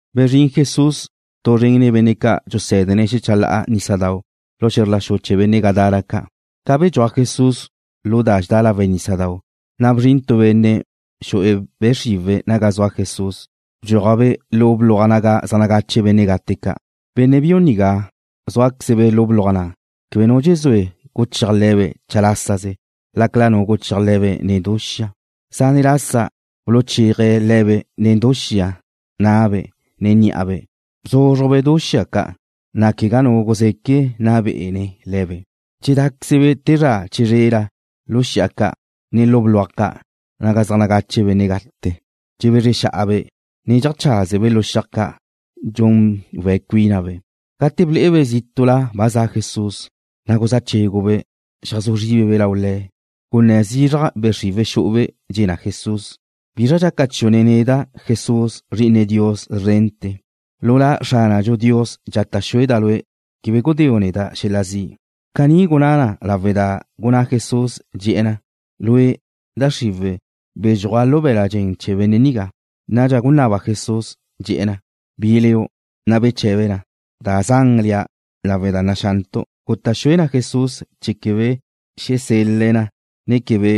Bezrín Jesús, tu zren nen benne' ca' dxusé̱dene̱' xecha la'a nísadau' lu xe̱zr la xu chee̱ benne' Gadara ca'. Ca bedxúaj Jesús lu da dxedá lawe' nísadau', na' bzrin tu benne' xu'e̱ be' xriwe̱' naga zua Jesús. Bedxúaje̱' lu bluaj naga zaj nagache benne' gate ca'. Benne' biu nigá zúaqueze̱' lu bluaj na'. Quebe nu dxezúe guchéaj le̱be' chalásaze, lácala nu guchéaj le̱be' nen du xia. Zane' lasa buluchéaje̱' le̱be' nen du xia na'abe', ne ní'abe'. Bzúzrujbe' du xia ca', na' quegá nu guzeque nna bé'ene̱' le̱be'. Dxedáquezebe' te zra chizrela lu xi'a ca', ne lu bluaj ca' naga zaj nagache benne' gate. Dxebezre xa'abe', ne dxeajcházebe' lu xiaj ca', dxun we̱' cuínabe'. Gate ble'ebe' zítu'la ba za Jesús, na' guzá chégube', xeajzú zríbebe' lau Le̱'. Gunné̱ zizraj be' xriwe̱' xu'ube', dxe̱ na Jesús: ―¿Bizra dxaca chiu' nen neda', Jesús, Zri'ine Dios szrente̱? Lu La Xránadxu Dios, dxata' xueda' Lue', quebe gudéu' neda' xel-la zi'. Caní gunná na lawe' da gunná Jesús, dxe̱'e̱ na: ―Lue', da xriwe̱', bedxúaj lu be̱l-la' dxen chee̱ benne' nigá. Nadxa gunaba Jesús, dxe̱'e̱ na: ―¿Bi leu'? Na' beche̱be na: ―Da Zan lea', lawe' da naxantu'. Guta' xue na Jesús chee̱ quebe xesel-le̱' na, ne quebe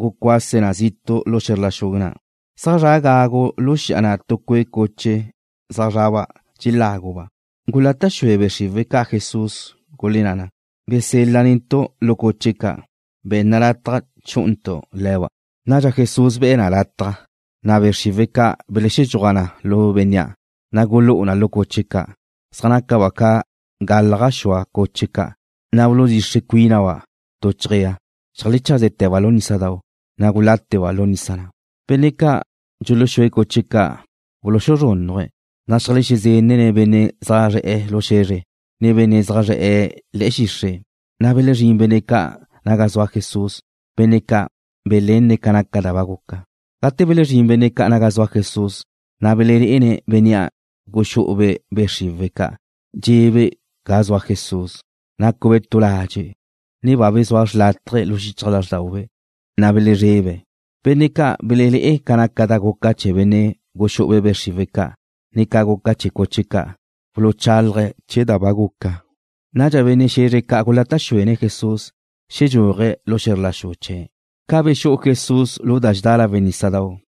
gucuase̱' na zitu' lu xe̱zr la xu na'. Zaj zra' gagu lu xi'a na' tu cue' cuche zaj zraba' dxeláguba'. Gulata' xue be' xriwe̱' ca' Jesús, gulenná na: ―Besel-la netu' lu cuche ca'. Be̱nna lataj chú'untu' le̱ba'. Nadxa Jesús be̱'e̱ na lataj. Na' be' xriwe̱' ca' beledxúaj na lu bénnea', na' gulú'u na cuche ca'. Zaj nácaba' ca galaj gaxúa cuche ca', na' buludxixre cuínaba' tu chejéa. Xeajlecháste̱ba' lu nísadau', ne gulátete̱ba' lu nisa na'. Benne' ca' dxuluxúe̱' cuche ca' buluxuzrúnnuje̱', na' xeajlezenne̱' benne' zaj zre̱'e̱ lu xe̱zre, ne benne' zaj zre̱'e̱ le̱'e̱ xixre'. Na' belezrín benne' ca' naga zua Jesús, benne' ca' belenne̱' ca da ba guca. Gate belezrín benne' ca' naga zua Jesús, na' belelé'ene̱' bénnea' guxú'ube' be' xriwe̱' ca', dxe'ebe' ga zua Jesús, nácube' tu ladze', ne ba bezúa xrlátaje lu xichaj lázrdaube', na' gulezrebe̱'. Benne' ca' belelé'e ca naca da guca chee̱ benne' guxú'ube' be' xriwe̱' ca', ne ca guca chee̱ cuche ca' buluchálaje̱' chee̱ da ba guca. Nadxa benne' xe̱zre ca' gulata' xuene̱' Jesús xedxúaje̱' lu xe̱zr la xu chee̱'. Ca bexú'u Jesús lu da dxedá lawe' nísadau',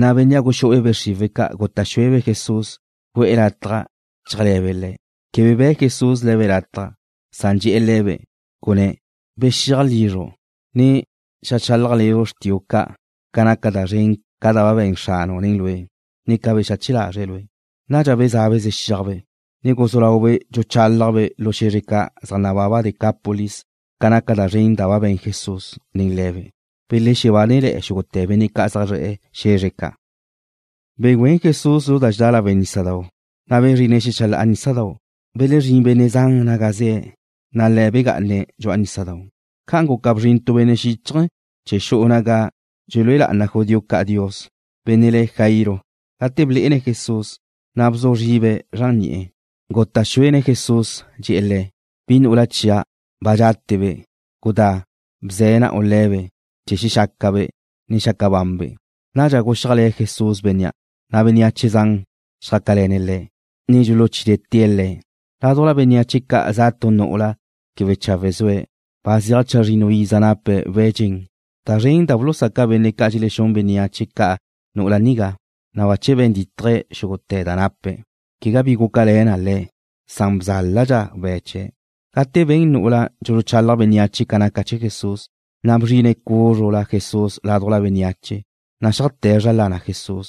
na' bénnea' guxú'ube' be' xriwe̱' ca' guta' xuebe' Jesús gu'e̱ lataj chéajle̱be' Le̱'. Quebe be̱' Jesús le̱be' lataj, san dxe̱'e̱ le̱be', gunné̱': ―Bexiaj lizru', ne xeajchálajle̱ xrtiu' ca' ca naca da zren ca' da be̱n Xranu' nen lue', ne ca bexache lazre̱' lue'. Nadxa bezá'abe' zexíajbe', ne guzú laube' dxuchálajbe' lu xe̱zre ca' zaj nababa Decápolis ca naca da zren da be̱n Jesús nen le̱be'. Belexebánele̱'e̱ xúgute̱ benne' zaj zre̱'e̱ xe̱zre ca'. Begüén Jesús lu da dxedá lawe' nísadau', na' bezrine̱' xecha la'a nísadau'. Belezrín benne' zan naga ze̱', na' Le̱' begá'ane̱' dxu'a nísadau'. Ca'an guca bzrin tu benne' xíchaje̱ chee̱ xu'u naga dxelúe lá'ana judío ca' Dios, benne' le̱' Jairo. Gate blé'ene̱' Jesús, na' bzu zribe̱' zran ni'e̱. Guta' xuene̱' Jesús, dxe̱'e̱ Le̱': ―¡Bi nu'ula chia' ba dxátebe'! ¡Gudá, bze̱ na'u le̱be' chee̱ xexácabe', ne xaca banbe'! Nadxa guxíajle̱ Jesús bénnea', na' bénneache zan xjácale̱ne̱' Le̱', ne dxuluchítee̱' Le̱'. Ládujla bénneache ca' za tu nu'ula quebe chawe' zue̱', ba zeaj chazrinnu iza nape̱' we̱' dxen. Da zren da bulusaca benne' dxelexún bénneache ca' nu'ula nigá, na' bache be̱n dítaje̱' xúgute̱ da nape̱'. Quegá bi gúcale̱ na le̱', san bzáladxa we̱' chee̱'. Gate ben nú'ula' dxuluchalaj bénneache ca naca chee̱ Jesús, na' bzrine̱' cúzrula Jesús ládujla bénneache, na' xeajté̱' zra lana Jesús.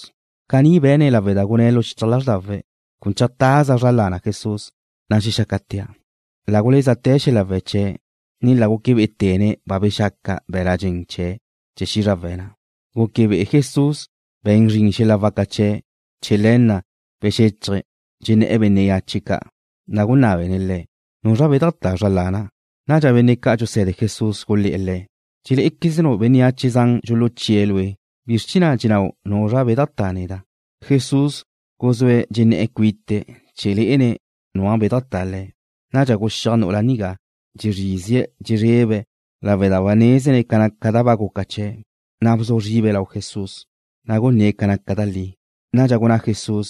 Caní be̱ne̱' lawe' da gunné̱' lu xichaj lázrdawe̱': Cun cheajtaza' zra lana Jesús, na' xexácatea'. La gulézate̱ xel-la we̱' chie̱', ne la guque bé'ete̱ne̱' ba bexaca be̱l-la' dxen chee̱' chee̱ xízrawe̱' na'. Gúquebe'e Jesús be̱n zrin xel-la waca chee̱'. Chee̱ le̱ na' bexéchaje̱', dxenné̱'e̱ bénneache ca', na' gunábene̱' le̱': ―¿Nuzra bedajtá zra lana'? Nadxa benne' ca' dxuse̱de Jesús gulé̱'e̱ Le̱': ―Dxelé'equeznu' bénneache zan dxuluchíe̱' Lue'. ¿Bizr chee̱ na' dxenabu': “Nuzra bedajtá neda'?” Jesús guzúe̱' dxenné̱'e̱ cuite̱' chee̱ lé'ene̱' nua' bedajtá Le̱'. Nadxa guxíaj nu'ula nigá, dxezrízie̱' dxezrebe̱' lawe' da nézene̱' ca da ba guca chee̱', na' bzu zribe̱' lau Jesús, na' gunné̱' ca naca da li. Nadxa gunná Jesús,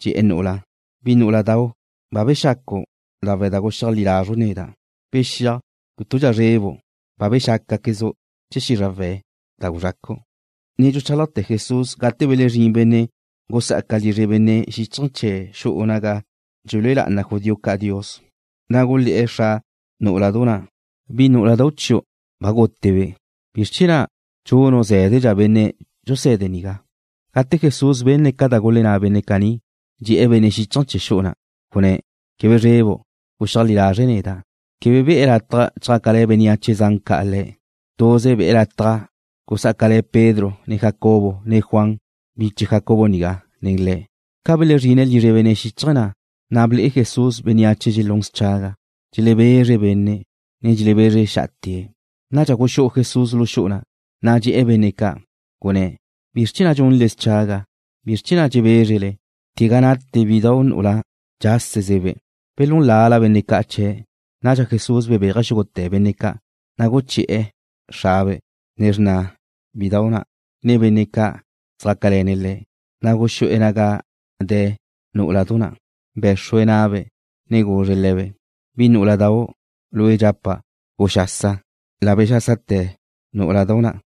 dxe̱'e̱ nu'ula': ―Bi nú'uladau', ba bexacu' lawe' da guxeajlí lazru' neda'. Bexíaj, cútudxa zrebu'. Ba bexácate̱quezu' chee̱ xízrawe̱' da guzxacu'. Ne dxuchálajte̱ Jesús gate belezrín benne' gusá'aca lizre benne' xíchaje̱ chee̱ xu'u naga dxelúe lá'ana judío ca' Dios, na' gulé̱'e̱ xra nú'uladau' na': ―Bi nú'uladau' chiu' ba gútebe'. ¿Bizr chee̱ na' dxunu' zé̱dedxa benne' dxuse̱de nigá? Gate Jesús benne̱' ca da gulenná benne' caní, dxe̱'e̱ benne' xíchaje̱ chee̱ xu'u na', gunné̱': ―Quebe zrebu'. Guxeajlí lazre' neda'. Quebe be̱'e̱ lataj chjácale̱ bénneache zan ca' Le̱'. Tuze be̱'e̱ lataj gusá'acale̱ Pedro, ne Jacobo, ne Juan, biche Jacobo nigá, nen Le̱'. Ca belezrine̱' lizre benne' xíchaje̱ na', na' ble'e Jesús bénneache dxelún schaga. Dxelebezre benne', ne dxelebezre xa'ate̱'. Nadxa guxú'u Jesús lu xu'u, na' dxe̱'e̱ benne' ca', gunné̱': ―¿Bizr chee̱ na' dxunle schaga? ¿Bizr chee̱ na' dxebézrele? Quegá nate bidau' nu'ula. Dxásezebe'. Belún lala benne' ca' chee̱'. Nadxa Jesús bebéaje̱' xúgute̱ benne' ca', na' guché̱'e̱ xrabe', ne xrna bidau' nigá, ne benne' ca' zjácale̱ne̱' Le̱', na' guxú'e̱ naga de̱ nú'uladu na'. Bé̱xrue̱' na'be', ne guzre̱' le̱be': ―Bi nú'uladau', lue' dxapa': ¡Guxasa! La bexásate̱ nú'uladu na',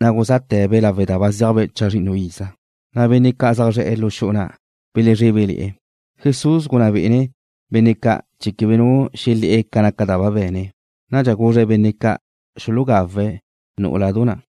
na' guzáte̱be' lawe' da ba zéajbe' chazrinnu iza. Na' benne' ca' zaj zre̱'e̱ lu xu'u na' belezrébele̱'e̱. Jesús gunná bé'ene̱' benne' ca' chee̱ quebe nu xelé̱'e̱ ca da be̱ne̱'. Nadxa guzré̱' benne' ca' xulugawe̱' nú'uladu na'.